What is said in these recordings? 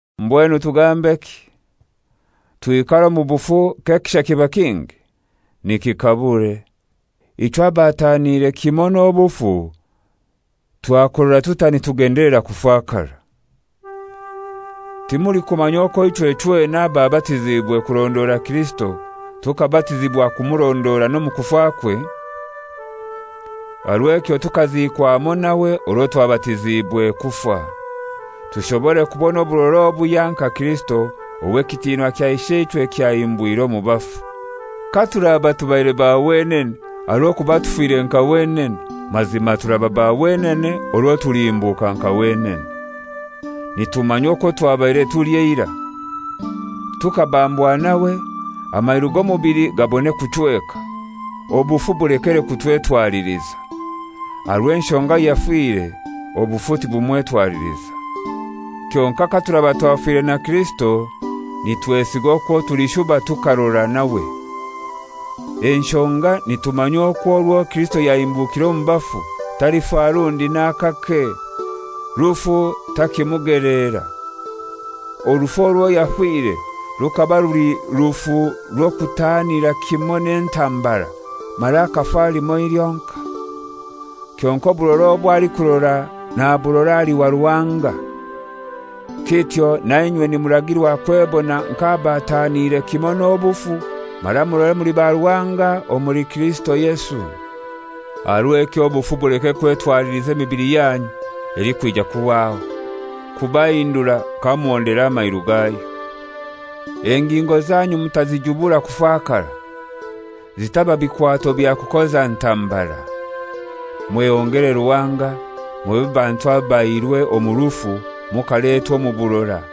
Mbwenu tugambeki? Twikare omu bufu k'ekisha kiba kingi? Nikikabure! Ichwe abataaniire kimoi n'obufu, twakurora tutai nitugendelera kufakara? Timulikumanya okwo ichwe chwena ababatiziibwe kurondora Kirisito tukabatizibwa kumurondora n'omu kufakwe? Aha rw'ekyo tukaziikwa hamoi nawe orwo twabatiziibwe kufa, tushobore kubona oburora obuhya nka Kirisito ow'ekitinwa kya Isheichwe kyahimbwire omu bafu. Katuraba tubaire ba wenene aha rw'okuba tufire nka wenene, mazima turaba ba wenene orwo tulihimbuka nka wenene. Nitumanya okwo twabaire tuli eirai, tukabambwa nawe, amairu g'omubili gabone kuchweka, obufu bulekere kutwetwaliliza. Aha rw'enshonga ayafire obufu tibumwetwaliliza. Kyonkai katuraba twafire na Kirisito, nitwesiga okwo tulishuba tukarora nawe. Enshonga nitumanya okwo orwo Kirisito yahimbukire omu bafu talifa rundi n'akake; rufu takimugeleera. Orufu orwo yafire rukaba ruli rufu rw'okutaanira kimoi n'entambara, mara akafa limoi lyonkai. Kyonkai oburora obwo alikurora naburora ali wa Ruhanga. Kityo na inywe nimuragirwa kwebona nk'abataaniire kimoi n'obufu, mara murore muli ba Ruhanga omuli Kirisito Yesu. Aha rw'ekyo obufu buleke kwetwaliliza emibili yanyu elikwija kuhwaho, kubakora kamuhondera amairu gayo. Engingo zanyu mutazijubura kufakara, zitaba bikwato bya kukoza ntambara. Mwehongere Ruhanga, mube bantu abaihirwe omu rufu mukaletwa omu burora,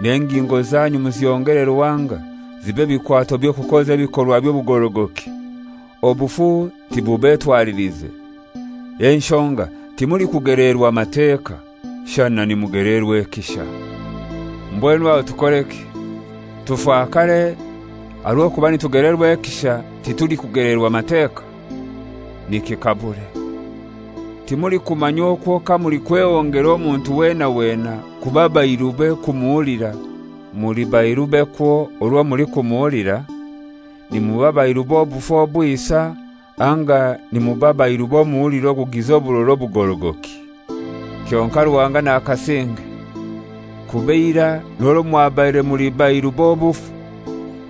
n'engingo zanyu muzihongere Ruhanga zibe bikwato by'okukoza ebikorwa by'obugorogoki. Obufu tibubetwalilize, enshonga timulikugeleerwa Mateka, shana nimugeleerwa ekisha. Mbwenu aho tukoreki? Tufakare aha rw'okuba nitugeleerwa ekisha titulikugeleerwa Mateka? Nikikabure! Timulikumanya okwo kamulikwehongera omuntu wena wena kuba bairube kumuhulira, muli bairube kwo orwo mulikuhulira? Nimuba bairu b'obufu obwisa, anga nimuba bairu b'omuhuliro ogugiza oburora obugorogoki. Kyonkai Ruhanga nakasinge! Kuba eirai n'orwo mwabaire muli bairu b'obufu,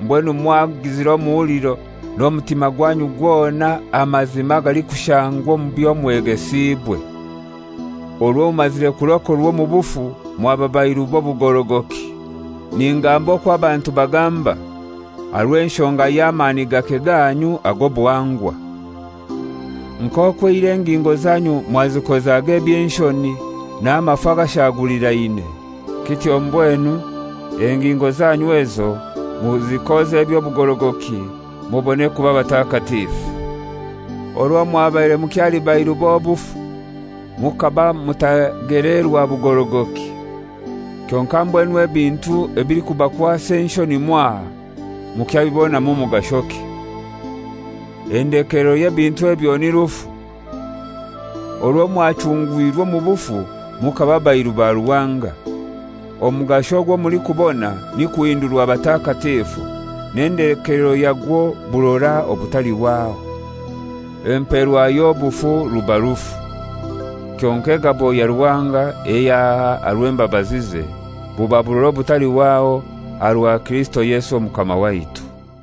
mbwenu mwagizire omuhuliro n'omutima gwanyu gwona aha mazima agalikushangwa omu byomwegesiibwe. Orwo mumazire kurokorwa omu bufu mwaba bairu b'obugorogoki. Ningamba okwo abantu bagamba, aha rw'enshonga y'amani gake ganyu ag'obuhangwa. Nk'okwo eirai engingo zanyu mwazikozaga eby'enshoni n'amafu agashagulirane, kityo mbwenu engingo zanyu ezo muzikoze eby'obugorogoki mubone kuba batakatifu. Orwo mwabaire mukyali bairu b'obufu, mukaba mutagelerwa bugorogoki. Kyonkai mbwenu ebintu ebilikubakwasa enshoni mwaha mukyabibonamu mugashoki? Endekelero y'ebintu ebyo ni rufu. Orwo mwachungwirwe omu bufu mukaba bairu ba Ruhanga, omugasho ogwo mulikubona ni kuhindurwa batakatifu, n'endekeelero yagwo burora obutalihwaho. Empeerwa y'obufu ruba rufu, kyonkai egabo ya Ruhanga eyo aha aha rw'embabazize, buba burora obutalihwaho aha rwa Kirisito Yesu Omukama waitu.